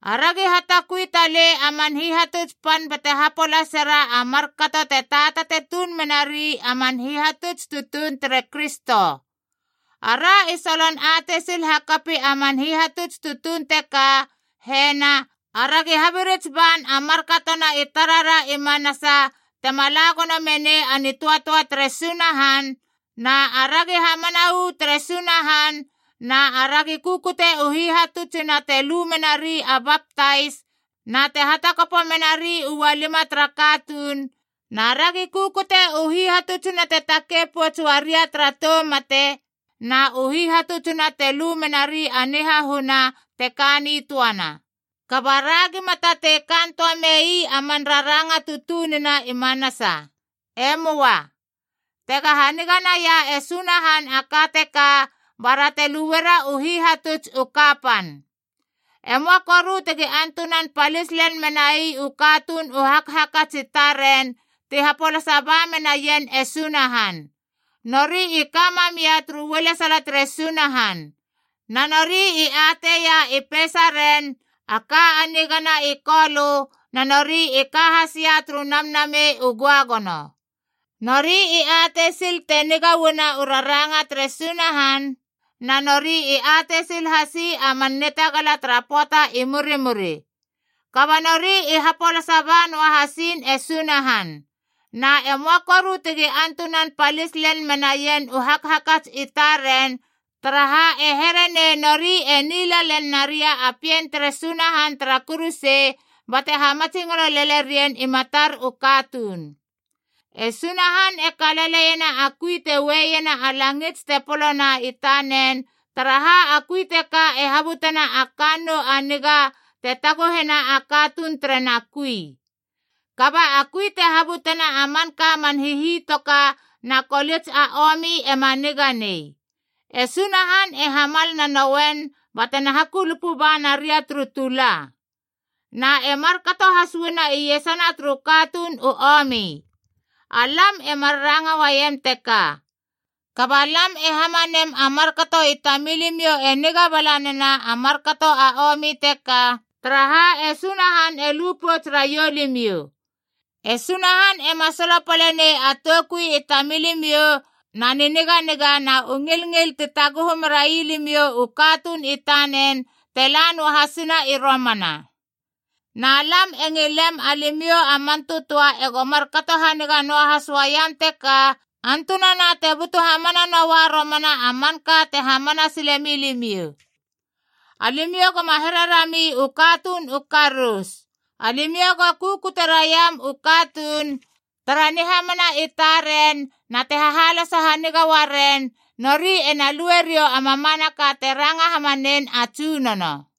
Aragi hatakui talei a man hihatuts pan bate hapolaseraa a markato te taatate tuun menari a man hihatuts tutuun tere Kristo. Ara i solon atei sil hakapi a man hihatuts tutuun teka, hena: Aragi habirits ban a markatona i tarara i manasa tema la gono menei a nitöatöa tere Sunahan, na aragi hamana uu tere Sunahan, na aragi kukute u hihatutsina te lu menari a baptais na te hatakopo menari ualima tara katuun, na ragi kukute u hihatutsina te takei pouts uaria tara tou mate na u hihatutsina te lu menari a nihahuna te ka nitöana. Kaba, ra gima tatei kaan töa mei a man raranga tutunina i manasa. E möa. Tega haniga naia e Sunahan a ka teka bara te luera u hihatuts u kapan. E möa koru tegi antunan palis lel menai u katuun u hakhakats i taren ti hapolasa ba menaien e Sunahan. Nori i ka mamia turu ualesala tere Sunahan. Na nori i atei ia i peisaren, a ka a nigana i Kolö, na nori i ka hasia turu Namnamei u Göagono. Nori i atei sil te niga uana u raranga tere Sunahan, na nori i atei sil hasi a man nitagala tara pöata i murimuri. Kaba nori i hapolasa ba noa hasiin e Sunahan. Na e möa koru tegi antunan palis lel menaien u hakhakats i taren, taraha e here nei nori e nila lel naria a Pien tere Sunahan tara kuruse, bate hamatsingolo lele rien i matar u katuun. E Sunahan e kalaleiena a kui te ue iena a langits te polona i tanen, taraha a kui teka e habutena a kannou a niga te taguhena a katuun terena kui. Kaba a kui te habutena a manka a man hihitoka na kolits a omi ema niga nei. E Sunahan e hamal nanouen ba tena hakulupu ba naria turu tula. Na e markato has uana iesana turu katuun u omi. Alam e mar ranga uaiem teka, kaba lam e hamanem a markato i tamilimiou e niga bala nena a markato a omi teka, taraha e Sunahan e lu pouts raiou limiou. E Sunahan ema solopale nei a toukui i tamilimiou na niniganiga na u ngilngil ti taguhu merai limiou u katuun i tanen te la noahasina i romana. Na lam e ngilem alimiou a man tötöa ego markato haniga noahas uaiam teka, antunana te butu hamana noa romana a manka te hamana silemi limiou. Alimiou goma here rami u katuun u karous. Alimiou go kukute raiam u katuun, tara nihamana i taren na te hahaloso haniga uaren, nori ena lueriou a mamanaka te ranga hamanein a Tsunono.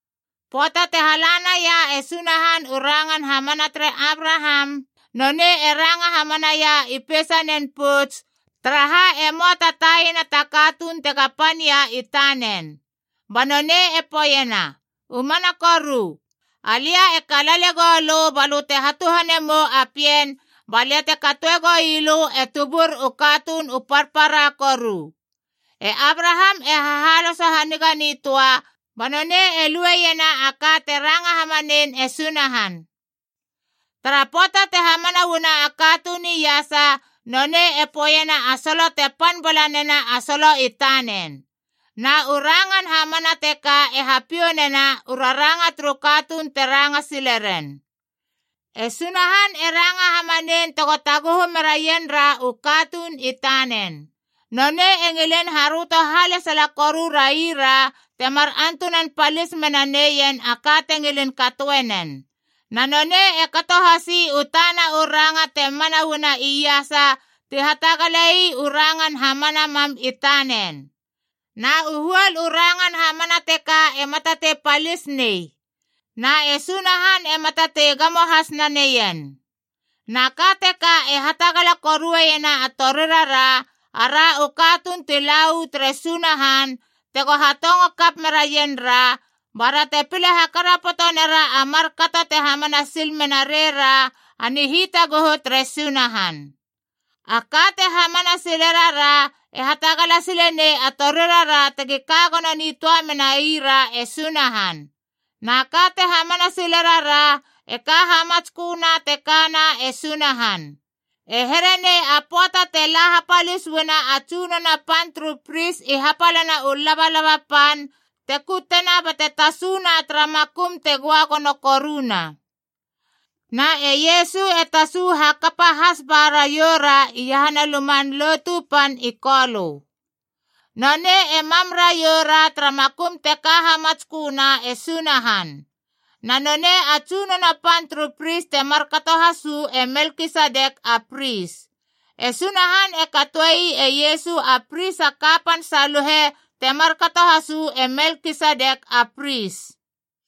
Pöata te hala naia e Sunahan u rangan hamana tere Abraham, nonei e ranga hamanaia i peisanen pouts, taraha e möa ta taina ta katuun tega pania i tanen. Ba nonei e poeiena, “U mana koru, alia e kalale gou lö balö te hatuhane mou a pien ba lia te katoe goi lö e tubur u katuun u parpara koru.” E Abraham e hahaloso haniga nitöa, ba nonei e lueiena a ka te ranga hamanein e Sunahan. Tara pöata te hamana uana a katuun iasa, nonei e poeiena a solo te pan bala nena a solo i tanen. Na u rangan hamana teka e hapiou nena u raranga turu katuun te ranga sile ren. E Sunahan e ranga hamanein tego taguhu meraien ra u katuun i tanen. Nonei e ngilin haröto halesala koru raira tema antunan palis menaneien a ka te ngilin katoe nen. Na nonei e kato hasi u tana u ranga te mana uana iasa ti hatagale ii u rangan hamana mam i tanen. Na u huol u rangan hamana teka ema tatei palis nei, na e Sunahan ema tatei gamo has naneien. Na ka teka e hatagala koruena a torirara, ara u katuun ti la uu tere Sunahan tego hatongo kap meraien ra, bara te pile hakarapoto nera a markato te hamana sil mena rei ra a nihitaguhu tere Sunahan. A ka te hamana sile rara e hatagala sile nei a torirara tegi ka gono nitöa menai ra e Sunahan. Na ka te hamana sile rara e ka hamatsköna te kana e Sunahan. E here nei a pöata te la hapalis uana a tsunono pan turu pris i hapalana u labalaba pan te kutena bate tasuna tara makum te göagono koruna. Na e Iesu e tasu hakapa has ba raiou ra iahana Luman Lotu Pan i Kolö. Nonei e mam raiou ra tara makum te ka hamatsköna e Sunahan. Na nonei a tsunono pan turu pris te markato has uu e Melkisedek a pris. E Sunahan e katoe ii e Iesu a Pris a kapan saluhe te markato has uu e Melkisedek a pris.